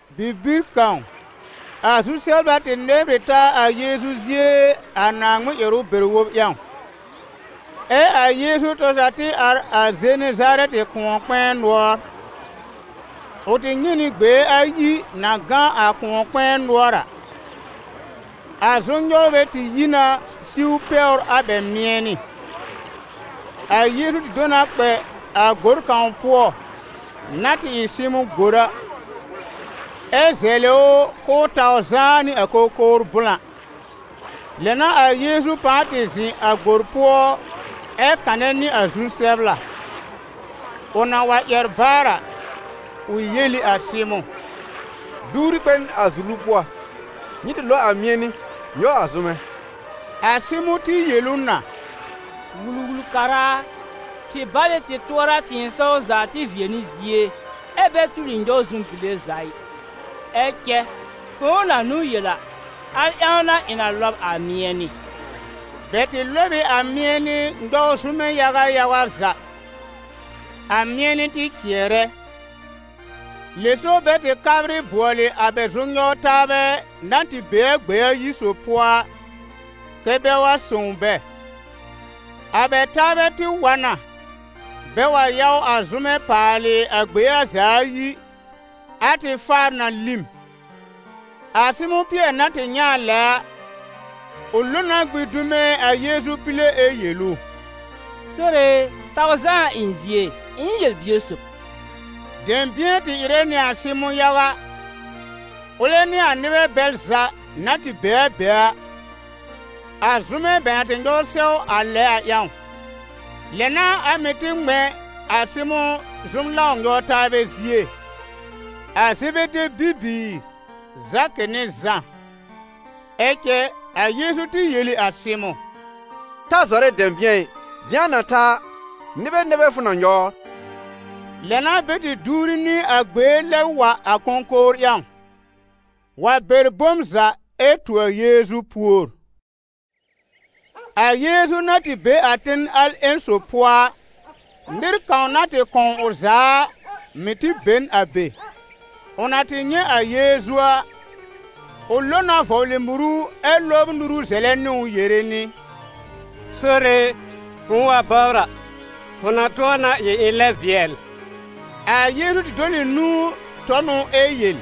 Bibir kãw, a zu-sɛbla tɩ nɛbr ɩ taa a Yeezu zie a Naaŋmɩn ƴɛrʋ bɛr-wob ƴãw, ɛ a Yeezu tɔr za tɩ ar a Zenezarɛtɩ kʋ̃ɔ-kpɛ̃ɛ nʋɔr. Ʋ tɩ nyɛ̃ nɩ gbee ayi na gã a kʋ̃ɔ-kpɛ̃ɛ nʋɔr a: a zʋm-nyɔwrbɛ tɩ yi na siw pɛwr a bɛ mɩ̃ɛnɩ. A Yeezu tɩ do na kpɛ a gbor kãw pʋɔ, na tɩ ɩ Sɩmʋ̃ gbor a, ɛ zɛlɩ ʋ k'ʋʋ taw zãá nɩ a kõkowr blã. Lɛ n'a a Yeezu pãa tɩ zɩ̃ a gbor pʋɔ ɛ kanɛ nɩ a zu-sɛbla. Ʋ na wa ƴɛr baar a, ʋ yel ɩ a Sɩmʋ̃: «Duwri kpɛ n a zulu pʋɔ, nyɩ tɩ lɔb a mɩ̃ɛnɩ nyɔw a zʋmɛ.» A Sɩmʋ̃ tɩ yel ʋ na: «Wul-wul-kara a, tɩ bal ɩ tɩ tʋɔra a tɩ̃ɩsɔw za tɩ vɩɛ nɩ zie, ɛ bɛ tuli nyɔw zʋm-bile za ɩ. Ɛ cɛ fʋ̃ʋ na n'ʋ yel a, al ƴãw n'a ɩ̃ na lɔb a mɩ̃ɛnɩ.» Bɛ tɩ lɔb ɩ a mɩ̃ɛnɩ nyɔw zʋmɛ yaga yaga za, a mɩ̃ɛnɩ tɩ cɩɛrɛ. Lɛ so bɛ tɩ kabrɩ bʋɔlɩ a bɛ zʋm-nyɔw-taabɛ na tɩ be a gbee ayi sob pʋɔ a, kɛ́ bɛ wa sõw bɛ. A bɛ taabɛ tɩ wa na, bɛ wa yaw a zʋmɛ paalɩ a gbee a za ayi a tɩ faar na lĩm. A Sɩmʋ̃ Pɩɛr na tɩ nyɛ̃ a lɛ a, ʋ lo na gbĩ dume a Yeezu pile ɛ yel ʋ: «Sore e, taw zaa a ɩ̃ zie, ɩ̃ ɩ n yel-bier sob.» Dɛ̃bɩ̃ɛ tɩ ɩrɛ nɩ a Sɩmʋ̃ yaga, ʋlɛ nɩ a nɩbɛ bɛl za na tɩ be a be a, a zʋmɛ bɛ na tɩ nyɔw sɛw a lɛ a ƴãw. Lɛ n'a a mɩ̀ tɩ ŋmɛ̃ a Sɩmʋ̃ zʋm-lãw-nyɔw-taabɛ zie, a Zebede bibiir, Zakɩ nɩ Zã. Ɛ cɛ a Yeezu tɩ yel ɩ a Sɩmʋ̃: «Ta zɔrɛ dɛ̃bɩ̃ɛ ɩ, dɩ̃a na ta a, nɩbɛ nɛ bɛ fʋ na nyɔwr» Lɛ n'a bɛ tɩ duwri nɩ a gbee lɛb wa a kõkowr ƴãw, wa bɛr bom za ɛ tu a Yeezu pùor. A Yeezu na tɩ be a ten al ƴẽn sob pʋɔ a, nɩr kãw na tɩ kɔ̃w ʋ za a, mɩ̀ tɩ be n a be. Ʋ na tɩ nyɛ̃ a Yeezu a, ʋ lo na vɔblɩ muru ɛ lɔbr nuru zɛlɛ nɩ ʋ yere nɩ: «Sore e, fʋ̃ʋ wa bɔbr a, fʋ na tʋ̃ɔ na ɩ ɩ̃ lɛb vɩɛl.» A Yeezu tɩ dɔl ɩ nũu tɔ n ʋ ɛ yel: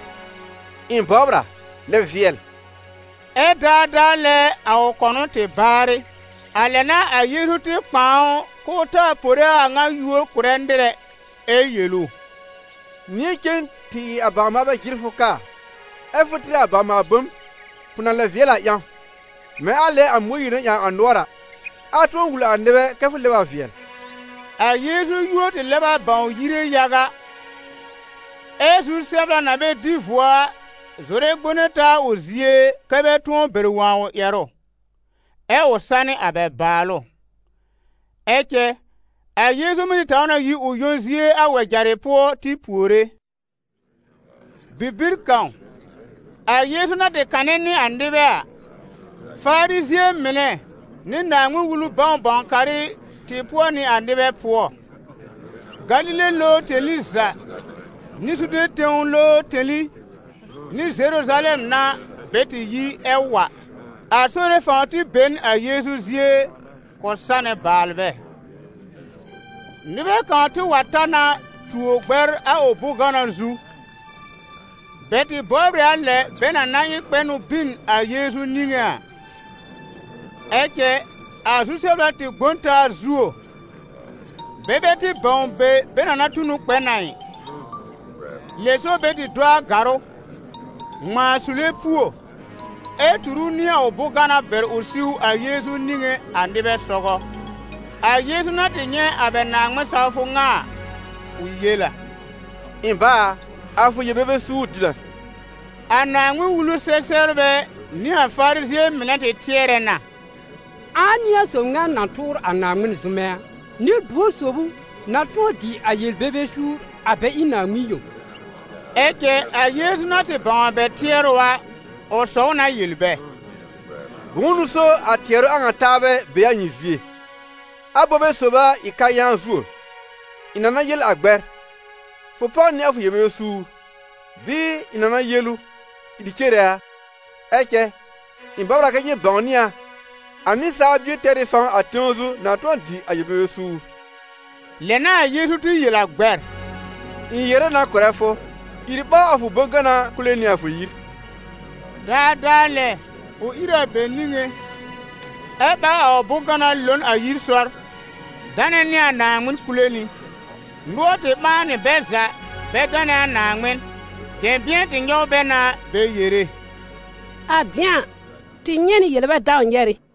«Ɩ̃ bɔbr a, lɛb vɩɛl!» Ɛ́ daadaa lɛ a ʋ kɔnʋ tɩ baarɩ. A lɛ n'a a Yeezu tɩ kpãa ʋ k'ʋʋ taa pore a a ŋa yúor kʋ̀rɛ nɩr ɛ, ɛ yel ʋ: «Nɩ̃ɛ cen tɩ ɩ a bawr-maalbɛ jɩr fʋ ka a, ɛ́ fʋ tɩr a bawr-maal-bom, fʋ na lɛb vɩɛl a ƴãw, mɛ̃ a lɛ a Mõyiir na ƴãw a nʋɔr a: a tʋ̃ɔ wul a nɩbɛ kɛ fʋ lɛb a vɩɛl.» A Yeezu yúor tɩ lɛb a bãw yire yaga, ɛ zu-sɛbla na bɛ dɩ vuo a zɔrɛ gbone taa a ʋ zie kɛ́ bɛ tʋ̃ɔ bɛr wõ a ʋ ƴɛrʋ, ɛ ʋ sanɩ a bɛ bàalʋ. Ɛ cɛ a Yeezu mɩ́ tɩ taw na yi ʋ yõ zie a wɛjarɩ pʋɔ tɩ puore. Bibir kãw a Yeezu na tɩ kanɛ nɩ a nɩbɛ a, Farizɩ̃ɛ mɩnɛ nɩ Naaŋmɩn-Wulu bãw-bãw-karɩ tɩ pʋɔ nɩ a nɩbɛ pʋɔ. Galile lowr tẽli za, nɩ Zude tẽw lowr tẽli nɩ Zeruzalɛm n'a bɛ tɩ yi ɛ wa. A Sore fãw tɩ be n a Yeezu zie k'ʋ sanɛ baalbɛ. Nɩbɛ kãw tɩ wa ta na tuo gbɛr a ʋ bʋ̃-gana zu. Bɛ tɩ bɔbr ɩ a lɛ bɛ na na ɩ kpɛ n ʋ bin a Yeezu niŋé a. Ɛ cɛ a zu-sɛbla tɩ gbõ n taa zuo, bɛ bɛ tɩ bãw be bɛ na na tu n ʋ kpɛ n a ɩ. Lɛ so bɛ tɩ do a gàrʋ́, ŋmãa sule puo, ɛ tur ʋ nɩ a ʋ bʋ̃-gana bɛr ʋ siw a Yeezu niŋé a nɩbɛ sɔgɔ. A Yeezu na tɩ nyɛ̃ a bɛ Naaŋmɩn-sawfʋ ŋa a, ʋ yel a: «Ɩ̃ ba a, a fʋ yel-bebe suur dɩ na.» A Naaŋmɩn-Wulu-sɛ-sɛbrbɛ nɩ a Farizɩ̃ɛ mɩnɛ tɩ tɩɛrɛ na: «Ãa n'ɩ a sob ŋa na tʋʋr a Naaŋmɩn zʋmɛ a? Nɩ-buor sob ʋ na tʋ̃ɔ dɩ a yel-bebe suur a bɛ ɩ Naaŋmɩn yõ?» Ɛ cɛ a Yeezu na tɩ bãw a bɛ tɩɛrʋ a, ʋ sɔw na yel bɛ: «Bʋ̃ʋ n'ʋ so a tɩɛrʋ a ŋa taabɛ be a nyɩ zie? Abobe sob a ɩ kayãan zuo: ɩ̃ na na yel a gbɛr: fʋ páw nɩ a fʋ yel-bebe suur, bɩɩ ɩ̃ na na yel ʋ: ìr cere a? Ɛ cɛ ɩ̃ bɔbr a kɛ nyɩ bãwnɩ a, a Nɩsaal Bie tɛr ɩ fãw a tẽw zu na tʋ̃ɔ dɩ a yel-bebe suur.» Lɛ n'a a Yeezu tɩ yel a gbɛr: «Ɩ̃ yere na kʋ̀rɛ fʋ, ìr ɓáw a fʋ bʋ̃-gana kule nɩ a fʋ yir.» Daadaa lɛ ʋ ìr a bɛ niŋé, ɛ ɓáw a ʋ bʋ̃-gana lo n a yir sɔr, danɛ nɩ a Naaŋmɩn kule nɩ. Nʋɔr tɩ ɓãa nɩ bɛ za bɛ danɛ a Naaŋmɩn; dɛ̃bɩ̃ɛ tɩ nyɔw bɛ na bɛ yere: «A dɩ̃a a, tɩ nyɛ̃ nɩ yel-bɛ-dãw-nyɛrɩ.»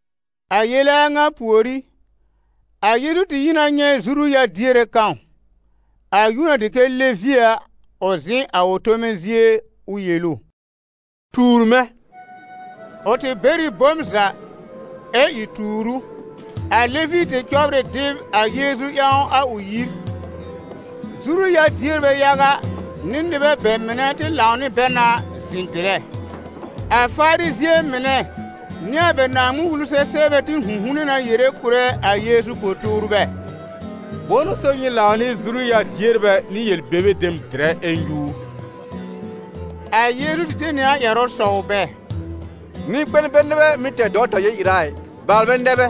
A yele a ŋa pùorí, a Yeezu tɩ yi na nyɛ̃ zuru-yar-diere kãw, a yúor na dɩ kɛ Levi a, ʋ zɩ̃ a ʋ tome zie, ʋ yel ʋ: «Tuur mɛ̃!» Ʋ tɩ bɛr ɩ bom za, ɛ ìr tuur ʋ. A Levi tɩ cɔbr ɩ dɩb a Yeezu ƴãw a ʋ yir; zuru-yar-dierbɛ yaga nɩ nɩbɛ bɛ mɩnɛ tɩ lãw nɩ bɛ na zɩ̃ dɩrɛ. A Farizɩ̃ɛ mɩnɛ nɩ a bɛ Naaŋmɩn-Wulu-sɛ-sɛbrbɛ tɩ 'hũ'hune na yere kʋ̀rɛ a Yeezu po-tuurbɛ: «Bʋ̃ʋ n'ʋ so nyɩ lãw nɩ zuru-yar-dierbɛ nɩ yel-bebe dem dɩrɛ ɛ nyúur?» A Yeezu tɩ de nɩ a ƴɛrʋ sɔw bɛ: «Nɩ-kpɛn bɛ nɛ bɛ mɩ́ tɛr dɔwta yel-ɩra ɩ, baalbɛ nɛ bɛ.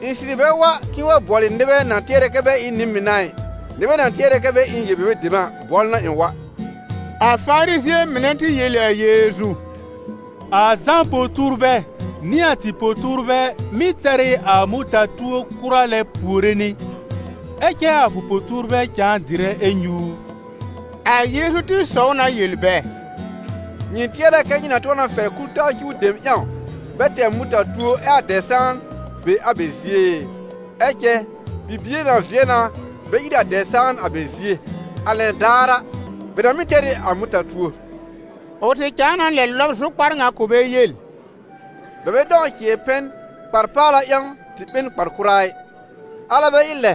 Ɩ̃ sɩrɩ bɛ wa k'ɩ̃ɩ wa bʋɔlɩ nɩbɛ na tɩɛrɛ kɛ bɛ ɩ n nɩ-mɩn a ɩ, nɩbɛ na tɩɛrɛ kɛ bɛ ɩ n yel-bebe dem a bʋɔlʋ n'a ɩ̃ wa.» A Farizɩ̃ɛ mɩnɛ tɩ yel ɩ a Yeezu: «A Zã po-tuurbɛ nɩ a tɩ po-tuurbɛ mɩ́ tɛr ɩ a mʋta-tuo kʋra lɛ puore nɩ, ɛ cɛ a fʋ po-tuurbɛ cãa dɩrɛ ɛ nyúur.» A Yeezu tɩ sɔw na yel bɛ: «Nyɩ tɩɛrɛ kɛ nyɩ na tʋ̃ɔ na fɛr kul-taa cuw dem ƴãw bɛ tɛr mʋta-tuo ɛ a dɛb-sãan be a bɛ zie e? Ɛ cɛ bibie na vɩɛ na bɛ ír a dɛb-sãan a bɛ zie, a lɛn daar a, bɛ na mɩ́ tɛr ɩ a mʋta-tuo.» Ʋ tɩ cãa na lɛ lɔb zʋkpar ŋa kʋ̀ bɛ yel: «Bɛ bɛ dãw cɩ̃ɛ pɛn kpar-paala ƴãw tɩ ɓe n kpar-kʋra ɩ, alɛ bɛ ɩ lɛ,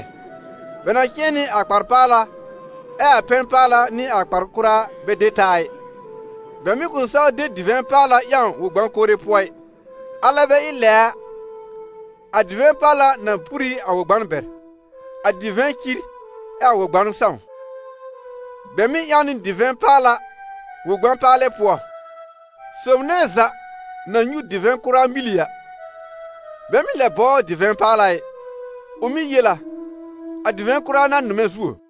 bɛ na cɩ̃ɛ nɩ a kpar-paala ɛ a pɛn-paala nɩ a kpar-kʋra bɛ de taa ɩ. Bɛ mɩ̀ kʋ̃ saw de divɛ̃ paala ƴãw wɔ-gbã-kore pʋɔ ɩ, alɛ bɛ ɩ lɛ a, a divɛ̃ paala na pur ɩ a wɔ-gban bɛr, a divɛ̃ cir ɛ a wɔ-gban sãw. Bɛ mɩ́ ƴãw nɩ divɛ̃ paala wɔ̃-gbã-paalɛ pʋɔ. Sob nɛ za na nyũ divɛ̃ kʋra mili a, bɛ mɩ́ lɛ bɔbr divɛ̃ paala ɩ, ʋ mɩ́ yel a: ‹A divɛ̃ kʋra n'a nʋmɛ zuo.›»